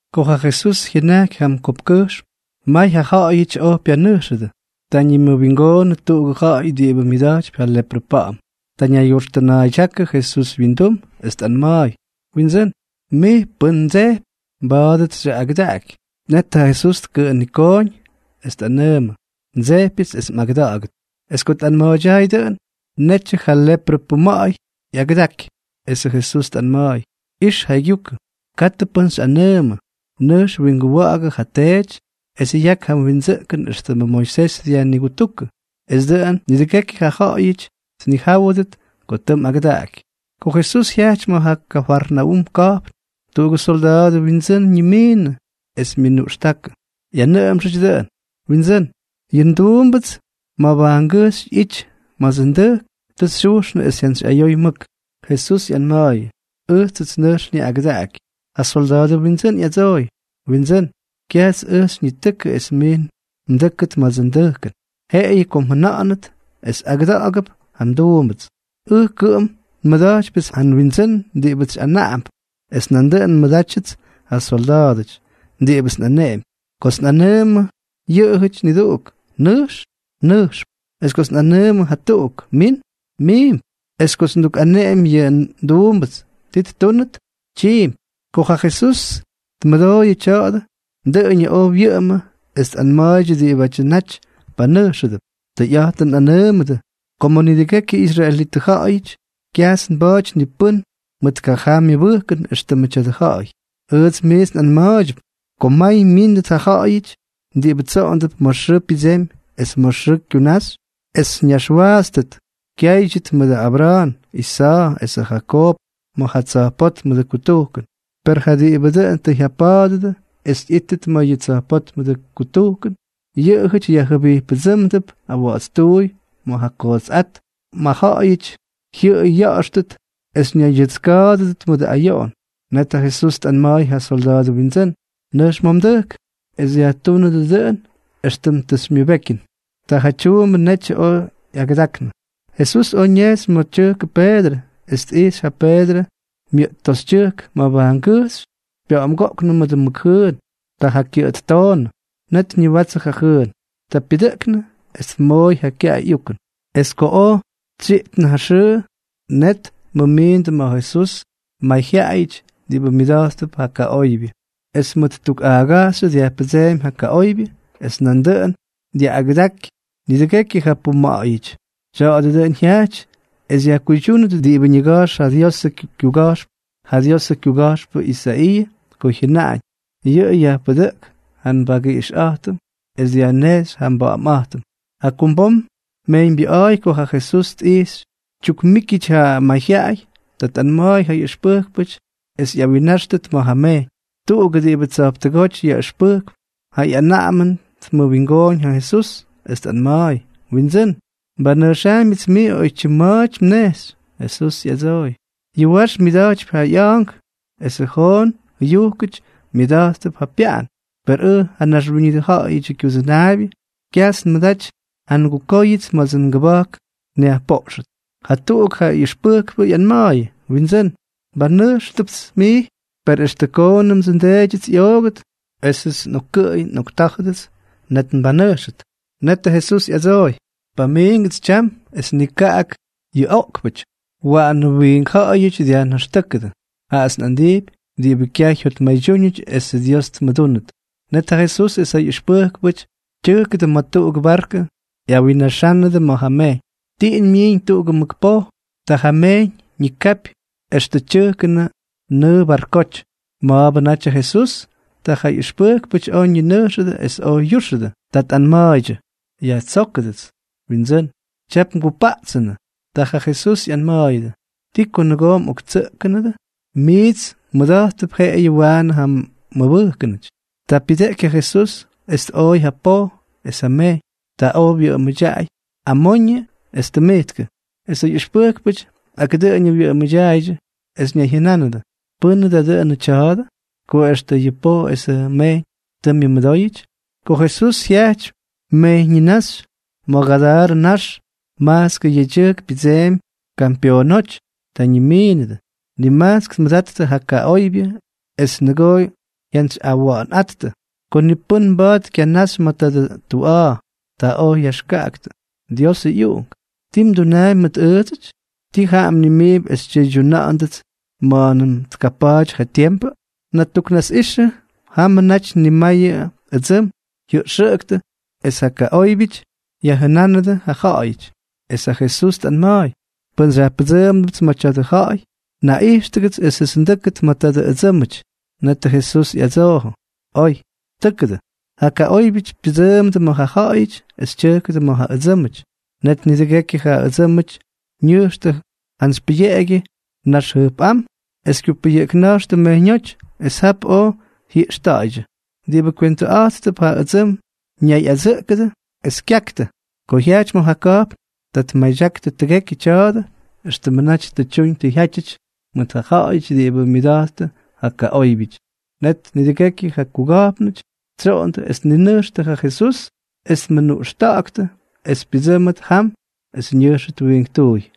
Ko ja Jesús jyʉnajky jam kopkkʉjxm, may ja ja̱ꞌa̱yʉty oj pyanʉjxʉdʉ. Ta ñimʉwingoonʉ tuꞌugʉ ja̱ꞌa̱y diꞌibʉ myʉda̱jtypy ja leprʉ pa̱ꞌa̱m. Ta ñaygyoxtʉna̱a̱ydyákʉ Jesús wyindum, es tꞌanma̱a̱y: —Windsʉ́n, mij pʉn mdsejpy, mba̱a̱dʉts xyaꞌꞌagʉdaꞌaky. Net ja Jesús tkʉꞌʉnikooñ, es tꞌanʉʉmʉ: —Ndsejpyʉts es mꞌagʉda̱ꞌa̱gʉt. Es ko tꞌanma̱a̱ydyaay dʉꞌʉn, netyʉ ja leprʉ puma̱ꞌa̱y ꞌyagʉdaky. Esʉ Jesús tꞌanma̱a̱y: —Ix jaygyukʉ. Katʉ pʉ́n xyꞌanʉʉmʉ. Nʉjx winguwa̱ꞌa̱gʉ ja teety, es yak ja mwindsʉꞌkʉn éxtʉmʉ Moisés dyajnigutujkʉ, es dʉꞌʉn nidʉgekyʉ ja̱ꞌa̱yʉty tnijáwʉdʉt ko tʉ mꞌagʉdaꞌaky. Ko Jesús jyajty ma̱ ja Kafarnaúm ka̱jpn, tuꞌugʉ solda̱a̱dʉ windsʉ́n ñimiinʉ, es myʉnuꞌxtákʉ, ꞌyanʉꞌʉmxʉty dʉꞌʉn: —Windsʉ́n, yʉ nduumbʉts mabajngʉjxy ꞌyity ma̱dsʉ ndʉjk, tʉ xyujxnʉ es jyantsyꞌayoy mʉk. Jesús ꞌyanma̱a̱yʉ: —Ʉjtsʉts nʉjx nyaꞌꞌagʉdaꞌaky. Ja solda̱a̱dʉ windsʉ́n ꞌyadsooy: —Windsʉ́n, kyajts ʉj xyñitʉkʉ es mij mdʉ́kʉt ma̱dsʉ ndʉjkʉn. Jeꞌeyʉ ko mjʉna̱ꞌa̱nʉt, es agʉda̱ꞌa̱gup ja nduumbʉts. Ʉj kʉꞌʉm nmʉda̱jtypyʉts ja nwindsʉ́n diꞌibʉts xyꞌanaꞌamp, es nandʉꞌʉn nmʉdátyʉts ja solda̱a̱dʉty diꞌibʉts nꞌaneꞌempy. Kots nꞌanʉʉmʉ yʉꞌʉjʉty niduꞌuk: “Nʉjx”, nʉjxp, es kots nꞌanʉʉmʉ jatuꞌuk: “Min”, miimp, es kots ndukꞌaneꞌemy yʉ nduumbʉts ti ttúnʉt, tyiimpy. Ko ja Jesús tmʉdooyʉ tya̱a̱dʉ, dʉꞌʉñʉ oj wyʉꞌʉmʉ es tꞌanma̱a̱ydyʉ diꞌibʉ naty panʉjxʉdʉp: —Tʉyꞌa̱jtʉn nꞌanʉʉmʉdʉ ko ma̱ nidʉgekyʉ israelitʉ ja̱ꞌa̱yʉty, kyajts nba̱a̱ty ni pʉ́n mʉt kajaa myʉbʉjkʉn éxtʉmʉ tya̱dʉ ja̱ꞌa̱y. Ʉjts miits nꞌanma̱a̱ydyʉp ko may myíndʉt ja ja̱ꞌa̱yʉty diꞌibʉ tsoꞌondʉp ma̱ xʉʉ pyʉdsemy es ma̱ xʉʉ kyunaxy, es ñaxwaatstʉt kyáydyʉt mʉdʉ Abra̱a̱n, Isa̱a̱ esʉ Jakoob ma̱ ja tsa̱jpótmʉdʉ kutujkʉn. Per ja diꞌibʉ dʉꞌʉn tʉ jyapa̱a̱dʉdʉ es ꞌyíttʉt ma̱ yʉ tsa̱jpótmʉdʉ kutujkʉn, yʉꞌʉjʉty yajjʉbijppʉdsʉ́mdʉp awa̱ꞌa̱tstuuy ma̱ ja kootsꞌát, ma̱ ja̱ꞌa̱yʉty jyʉꞌʉy ya̱ꞌa̱xtʉt es ñaydyʉtska̱a̱dʉdʉt mʉdʉ ayoꞌon. Net ja Jesús tꞌanma̱a̱y ja solda̱a̱dʉ windsʉ́n: —Nʉjx ma̱ mdʉjk, es yajtúnʉdʉ dʉꞌʉn éxtʉm tʉ xymyʉbekyʉn. Ta ja tyuumbʉ netyʉ oj ꞌyagʉdaknʉ. Jesús oj ñejxy ma̱ tyʉjkʉ Peedrʉ, es tꞌijxy ja Peedrʉ myʉꞌt toxytyʉjk mabajngʉjxy pya̱ꞌa̱mgoꞌknʉ mʉdʉ mʉk jʉʉn. Ta ja kyʉꞌʉ ttoonʉ. Net ñiwatsʉ ja jʉʉn. Ta pyʉdʉꞌknʉ es tmooy ja kyaꞌay ꞌyukʉn. Es ko oj tsyiꞌtnʉ ja xʉʉ, net tmʉmindʉ ma̱ Jesús may ja ja̱ꞌa̱yʉty diꞌibʉ myʉda̱jttʉp ja kaꞌoybyʉ. Es mʉt tuk a̱a̱gajxyʉ dyajpʉdseemy ja kaꞌoybyʉ, es nandʉꞌʉn dyaꞌꞌagʉdaky nidʉgekyʉ ja puma̱ꞌa̱yʉty. Tya̱a̱dʉ dʉꞌʉn jyajty es yajkuydyúnʉt diꞌibʉ ñiga̱jx ja Diosʉ kyuga̱jxpʉ Isaiiʉ ko jyʉnáñ: “Yʉꞌʉ yajpʉdʉꞌk ja nbagiꞌixꞌa̱jtʉm es dyajnejxy ja nba̱ꞌa̱mꞌa̱jtʉm.” Jakumbom mejyñbyʉꞌa̱a̱y ko ja Jesús tꞌijxy tyukmíkyʉty ja mayjyaꞌay, ta tꞌanma̱a̱y ja ꞌyʉxpʉjkpʉty es ꞌyawinnáxtʉt ma̱ ja mejyñ. Tuꞌugʉ diꞌibʉ tsa̱jptʉgóty yaꞌʉxpʉjkp ja ꞌyanaꞌamʉn tmʉwingooñ ja Jesús, es tꞌanma̱a̱y: —Windsʉ́n, nbanʉjxaambyʉts mij oytyim ma̱a̱ty mnejxy. Jesús ꞌyadsooy: —Yʉ wax myʉda̱jtypy ja ꞌya̱a̱nk esʉ joon jʉyujkʉty myʉda̱jttʉp ja pyaꞌan, per ʉj ja Naxwíñʉdʉ Ja̱ꞌa̱yʉdyʉ Kyudʉnaabyʉ, kyajts nmʉdaty ja ngukóyʉts ma̱dsʉ ngʉba̱jk nyajpoꞌxʉt. Jatuꞌuk ja ꞌyʉxpʉjkpʉ ꞌyanma̱a̱yʉ: —Windsʉ́n, nbanʉjxʉpts mij, per extʉ koonʉmdsʉ ndeedyʉts ꞌyoogʉt esʉts nꞌokkʉꞌʉy nꞌoktá̱jʉdʉts, net nbanʉjxʉt. Netʉ Jesús tꞌadsooy: —Pamiingʉts tyam es nikaꞌak yʉ oꞌkpʉty, waꞌanʉ wiink ja̱ꞌa̱yʉty dyajnaxtʉ́kʉdʉ. Jaꞌats nꞌandijpy diꞌibʉ kyaj jyotmaydyúñʉty esʉ Dios tmʉdúnʉt. Net ja Jesús es ja ꞌyʉxpʉjkpʉty tyʉjkʉdʉ ma̱ tuꞌugʉ barkʉ, es ꞌyawinnaxánʉdʉ ma̱ ja mejyñ. Tiꞌin myiiñ tuꞌugʉ mʉk poj. Ta ja mejyñ ñikapy extʉ tyʉjkʉnʉ nʉʉ barkoty. Ma̱a̱bʉ natyʉ Jesús. Ta ja ꞌyʉxpʉjkpʉty oj ñinʉjxʉdʉ es oj yúxʉdʉ. Ta tꞌanma̱a̱ydyʉ: —¡Yajtsóktʉgʉts, Windsʉ́n! ¡Tyap ngupaꞌtsʉnʉ! Ta ja Jesús ꞌyanma̱a̱yʉdʉ: —¿Ti ko nʉgoo mꞌoktsʉꞌkʉdʉ? Miits mmʉda̱jttʉp jeꞌeyʉ waanʉ ja mmʉbʉjkʉnʉty. Ta pyʉdeꞌky ja Jesús, es tꞌooy ja poj es ja mejyñ. Ta oj wyʉꞌʉmʉdyaꞌay amoñʉ es tʉmijtkʉ. Es ja ꞌyʉxpʉjkpʉty ak dʉꞌʉñʉ wyʉꞌʉmʉdyaaydyʉ, es ñayjyʉnánʉdʉ: —¿Pʉ́nʉ da dʉnʉ tya̱a̱dʉ?, ko extʉ yʉ poj es yʉ mejyñ tʉ myʉmʉdóyʉty. Ko Jesús jyajty mejyññináxy ma̱ Gadarʉ ñax, majtskʉ yedyʉjk pyʉdseemy kampyoonóty. Ta ñimiinʉdʉ. Nimajtsk tmʉdattʉ ja kaꞌóybyʉty es nʉgoo jyantsyꞌawa̱ꞌa̱nꞌáttʉ, ko ni pʉ́n mba̱a̱t kyanaxy ma̱ tadʉ tuꞌa̱a̱. Ta oj yaxkaꞌaktʉ: —Diosʉ ꞌyUꞌunk, ¿ti mdunaampy mʉt ʉʉdsʉty? ¿Tii jaꞌa mnʉmiimpy es xytyʉydyuna̱ꞌa̱ndʉts ma̱a̱nʉm tkapa̱a̱ty ja tiempʉ? Natuknasꞌixʉ jamʉ naty nimayʉ ʉdsʉm jyʉꞌxʉꞌʉktʉ, es ja kaꞌóybyʉty yajjʉnánʉdʉ ja ja̱ꞌa̱yʉty, es ja Jesús tꞌanma̱a̱y: —Pʉn xyajpʉdsʉmándʉpts ma̱ tya̱dʉ ja̱ꞌa̱y, naꞌijxtʉgʉts esʉts ndʉ́kʉt ma̱ tadʉ ʉdsʉ́mʉty. Netʉ Jesús ꞌyadsoojʉ: —Oy. Tʉ́kʉdʉ. Ja kaꞌóybyʉty pyʉdsʉʉmdʉ ma̱ ja ja̱ꞌa̱yʉty, es tyʉjkʉdʉ ma̱ ja ʉdsʉ́mʉty. Net nidʉgekyʉ ja ʉdsʉ́mʉty ñʉjxtʉ jantsy pʉyeꞌegyʉ nax jʉjpꞌám es kyupʉyʉꞌkna̱jxtʉ mejyñóty, es jap oj jyiꞌxta̱ꞌa̱ydyʉ. Diꞌibʉ kywentʉꞌa̱jttʉp ja ʉdsʉm ñayꞌadsʉꞌkʉdʉ, es kyaktʉ. Ko jyajty ma̱ ja ka̱jpn, ta tmadyaktʉ tʉgekyʉ tya̱a̱dʉ éxtʉmʉ naty tʉ tyuñ tʉ jyátyʉty mʉt ja ja̱ꞌa̱yʉty diꞌibʉ myʉda̱jttʉ ja kaꞌóybyʉty. Net nidʉgekyʉ ja kuga̱jpnʉty tsyoꞌondʉ es tninʉjxtʉ ja Jesús, es tmʉnuꞌxtáktʉ es pyʉdsʉ́mʉt jam es ñʉjxʉt wiinktuuy.